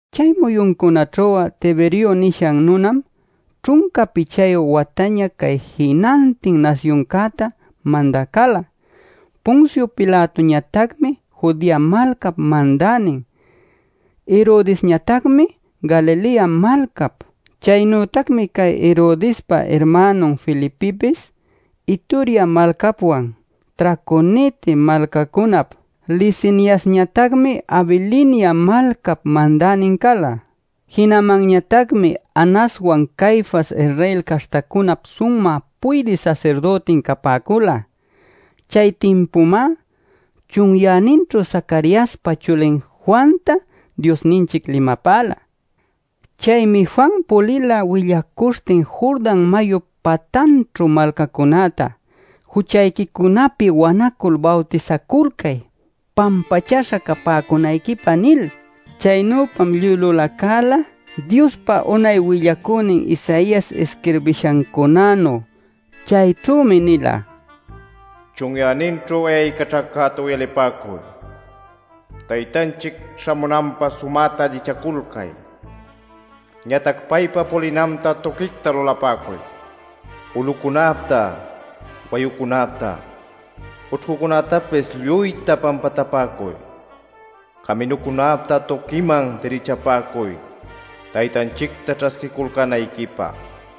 Chay muyuncunaćhu'a Tiberio nishan nunam ćhunca pichayu wataña cay jinantin nasyuncäta mandä cala. Poncio Pilatoñatacmi Judea malcap mandänin. Herodesñatacmi Galilea malcap. Chaynütacmi cay Herodespa irmänun Felipipis Ituria malcapwan Traconite malcacunap. Lisiniasñatacmi Abilinia malcap mandänin cala. Jinamanñatacmi Anaswan Caifas Israel caśhtacunap sumä puydï sasirdütin capäcula. Chay timpumá chunyäninćhu Zacariaspa chulin Juanta Diosninchic limapäla. Chaymi Juan pulila willacuśhtin Jordan mayup patanćhu malcacunäta: “Juchayquicunapi wanacul bawtisaculcay pampachäśha capäcunayquipä” nil. Chaynüpam lluy lulacala Diospa unay willacünin Isaias isquirbishancunänu. Chayćhümi nila: “Chunyäninćhu ayaycaćhäcäta uyalipäcuy: ‘Taytanchic ćhämunanpä sumäta allichaculcay. Ñatac paypa pulinanta tuquicta lulapäcuy. Ulucunäta, wayucunäta, ućhcucunätapis lluyta pampatapäcuy; caminucunäta tuquiman dirichapäcuy Taytanchicta ćhasquiculcänayquipä.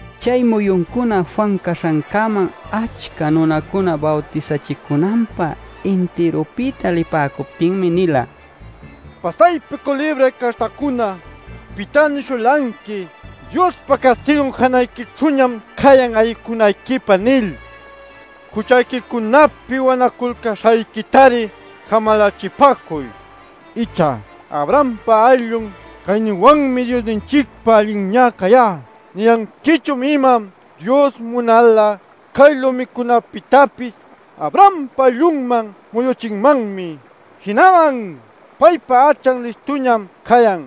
Chay muyuncuna Juan caśhancäman achca nunacuna bawtisachicunanpä intirupïta lipäcuptinmi nila: “Pasaypi culibray caśhtacuna, ¿pitá nishulanqui ‘¡Diospa castigun janayquićhüñam cayan ayicunayquipä!’ nil? Juchayquicunapi wanaculcäśhayquitari camalachipäcuy. Icha ‘Abrahampa ayllun caynïwanmi Diosninchicpa allinña cayá’ ¿niyanquichun, imam? Dios munal'a cay lumicunapïtapis Abrampa ayllunman muyuchinmanmi. Jinaman paypa ächan listuñam cayan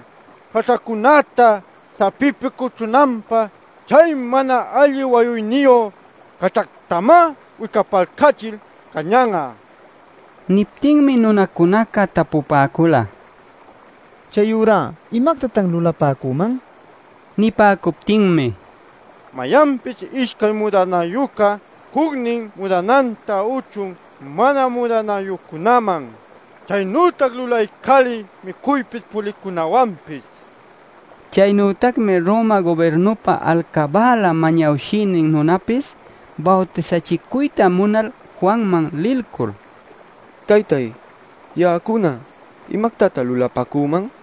jaćhacunäta sapipi cuchünanpä. Chay mana alli wayuyniyu jaćhactamá wicapalcachil cañan'a” nil. Niptinmi nunacunaca tapupäcula: “Chayurá ¿imactatan lulapäcüman?” nil. Nipäcuptinmi: “Mayanpis ishcay müdanayücá jucnin müdananta uchun mana müdanayücunäman. Chaynütac lulaycäliy micuypi pulïcunawanpis” nila. Chaynütacmi Roma gubirnupä alcabäla mañawshïnin nunapis bawtisachicuyta munal Juanman lilcul: “Taytay, ya'acuna ¿imactatan lulapäcüman?” nila.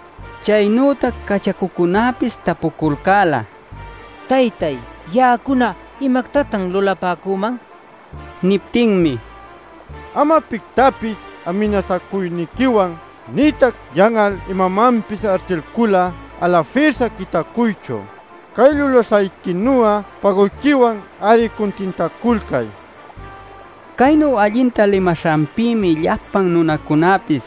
Chaynütac cachacucunapis tapuculcäla: “Taytay, ya'acuna, ¿imactatan lulapäcüman?” nil. Niptinmi: “Ama pictapis aminasacuyniquiwan'a nïtac yan'al imamanpis artilcul'a alafirsa quitacuychu. Cay lulaśhayquinu'a päguyquiwan-ari cuntintaculcay” nila. Caynu allinta limaśhanpïmi llapan nunacunäpis: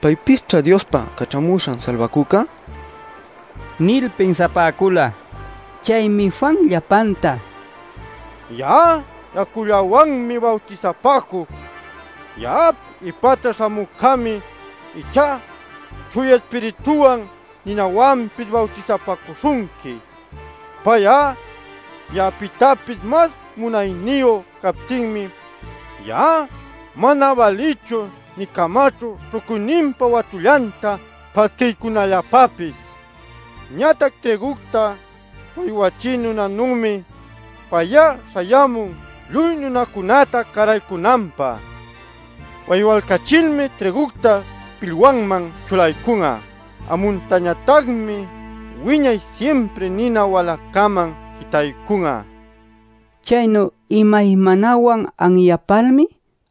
“¿Paypisćha Diospa Caćhamuśhan Salbacüca?” nil pinsapäcula. Chaymi Juan llapanta: “Ya'a yacullawanmi bawtisapäcuc. Ya'ap ipäta śhamücämi ichá Chuya Ispirituwan ninawanpis bawtisapäcuśhunqui. Pay'a ya'apïtapis mas munayniyu captinmi ya'a mana bälïchu nï camächu śhucuyninpa watullanta pasquiycunalläpäpis. Ñatac trïgucta waywachï nunanümi pay'a śhayämun, lluy nunacunäta cäraycunanpä. Waywalcachilmi trïgucta pilwanman ćhulaycun'a; amuntañatacmi wiñay simpri nina waläcäman jitaycun'a” nila. Chaynu imaymanawan anyapalmi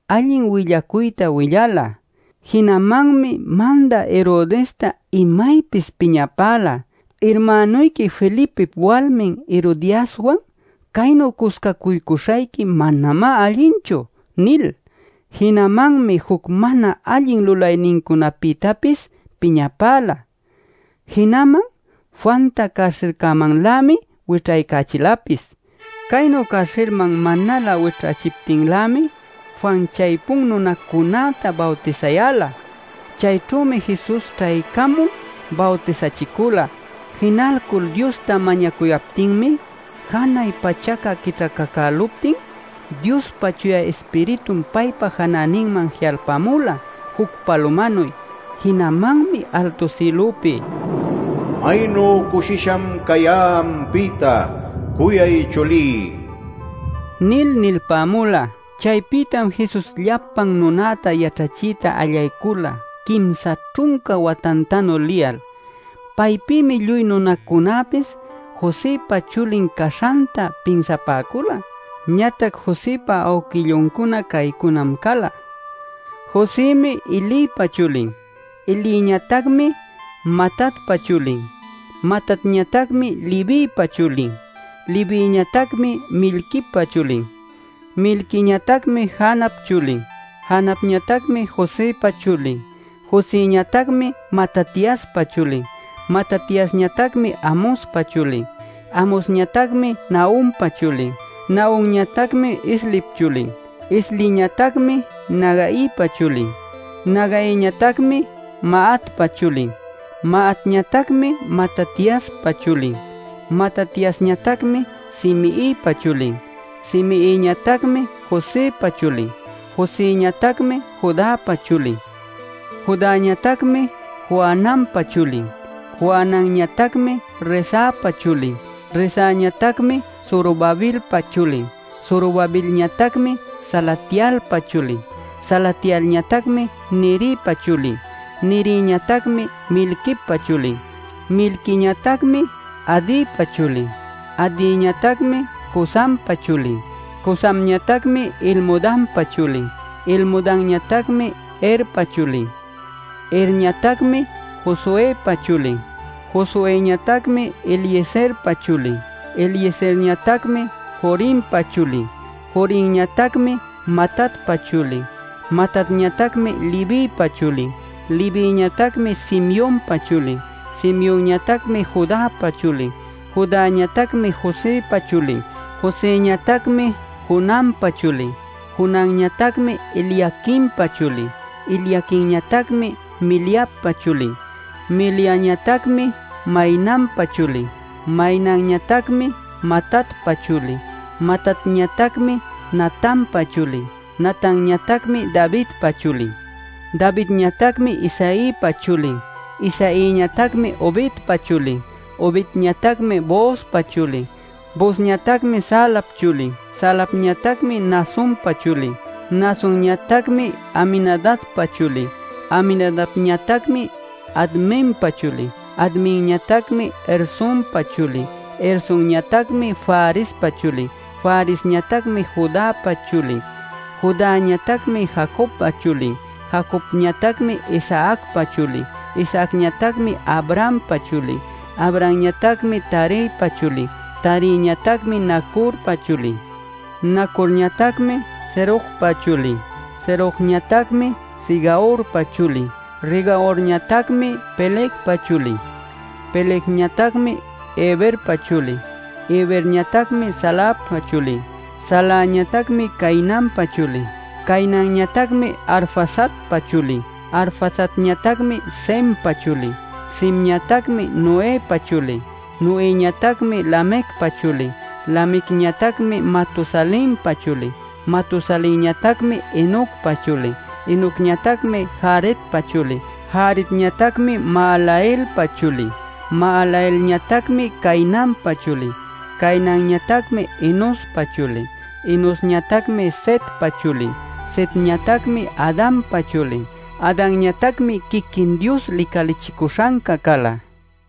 allin willacuyta willala. Jinamanmi mandä Herodesta imaypis piñapäla: “Irmänuyqui Felipip walmin Herodiaswan caynu cuscacuycuśhayqui manamá allinchu” nil. Jinamanmi juc mana allin lulaynincunapïtapis piñapäla. Jinaman Juanta carsilcämanlämi wićhaycächilapis. Caynu carsilman manalä wićhächiptinlämi Juan chaypun nunacunäta bawtisayäla. Chayćhümi Jesus ćhaycamul bawtisachicula. Jinalcul Diosta mañacuyaptinmi janay pachaca quićhacacüluptin Diospa Chuya Ispiritun paypa janäninman ji'alpamula juc palumanuy. Jinamanmi altu sïlupi: “¡Maynu cushisham cayá ampïta, cuyay chulí!” nil nilpamula. Chaypïtam Jesus llapan nunäta yaćhachiyta allaycula quimsa ćhunca watantanuy liyal. Paypïmi lluy nunacunapis Josëpa chulin caśhanta pinsapäcula. Ñatac Josëpa awquilluncuna caycunam cala: Josëmi Elïpa chulin. Elïñatacmi Matatpa chulin. Matatñatacmi Levïpa chulin. Levïñatacmi Melquip chulin. Melquiñatacmi Janap chulin. Janañatacmi Josëpa chulin. Josëñatacmi Matatiaspa chulin. Matatiasñatacmi Amospa chulin. Amosñatacmi Nahumpa chulin. Nahumñatacmi Eslip chulin. Esliñatacmi Nagaïpa chulin. Nagaïñatacmi Maatpa chulin. Maatñatacmi Matatiaspa chulin. Matatiasñatacmi Semeïpa chulin. Semeïñatacmi Josëpa chulin. Josëñatacmi Judäpa chulin. Judäñatacmi Joananpa chulin. Joananñatacmi Resäpa chulin. Resäñatacmi Zorobabelpa chulin. Zorobabelñatacmi Salatielpa chulin. Salatielñatacmi Nerïpa chulin. Nerïñatacmi Melquip chulin. Melquiñatacmi Adïpa chulin. Adïñatacmi Cosampa chulin. Cosamñatacmi Elmodanpa chulin. Elmodanñatacmi Erpa chulin. Erñatacmi Josuëpa chulin. Josuëñatacmi Elieserpa chulin. Elieserñatacmi Jorinpa chulin. Jorinñatacmi Matatpa chulin. Matatñatacmi Levïpa chulin. Levïñatacmi Simeonpa chulin. Simeonñatacmi Judäpa chulin. Judäñatacmi Josëpa chulin. Josëñatacmi Jonampa chulin. Jonamñatacmi Eliaquimpa chulin. Eliaquimñatacmi Meleap chulin. Meleañatacmi Mainanpa chulin. Mainanñatacmi Matatap chulin. Matatañatacmi Natanpa chulin. Natanñatacmi Davidpa chulin. Davidñatacmi Isaïpa chulin. Isaïñatacmi Obedpa chulin. Obedñatacmi Boozpa chulin. Boozñatacmi Salap chulin. Salañatacmi Naasonpa chulin. Naasonñatacmi Aminadabpa chulin. Aminadabñatacmi Adminpa chulin. Adminñatacmi Esrompa chulin. Esromñatacmi Farespa chulin. Faresñatacmi Judäpa chulin. Judäñatacmi Jacobpa chulin. Jacobñatacmi Isaacpa chulin. Isaacñatacmi Abrahampa chulin. Abrahamñatacmi Tarëpa chulin. Tarëñatacmi Nacorpa chulin. Nacorñatacmi Serugpa chulin. Serugñatacmi Regaurpa chulin. Regaurñatacmi Pelegpa chulin. Pelegñatacmi Heberpa chulin. Heberñatacmi Salap chulin. Salañatacmi Cainanpa chulin. Cainanñatacmi Arfaxadpa chulin. Arfaxadñatacmi Sempa chulin. Semñatacmi Noëpa chulin. Noëñatacmi Lamecpa chulin. Lamecñatacmi Matusalenpa chulin. Matusalenñatacmi Enocpa chulin. Enocñatacmi Jaredpa chulin. Jaredñatacmi Mahalalelpa chulin. Mahalalelñatacmi Cainanpa chulin. Cainanñatacmi Enospa chulin. Enosñatacmi Setpa chulin. Setñatacmi Adanpa chulin. Adanñatacmi quiquin Dios licalichicuśhanca cala.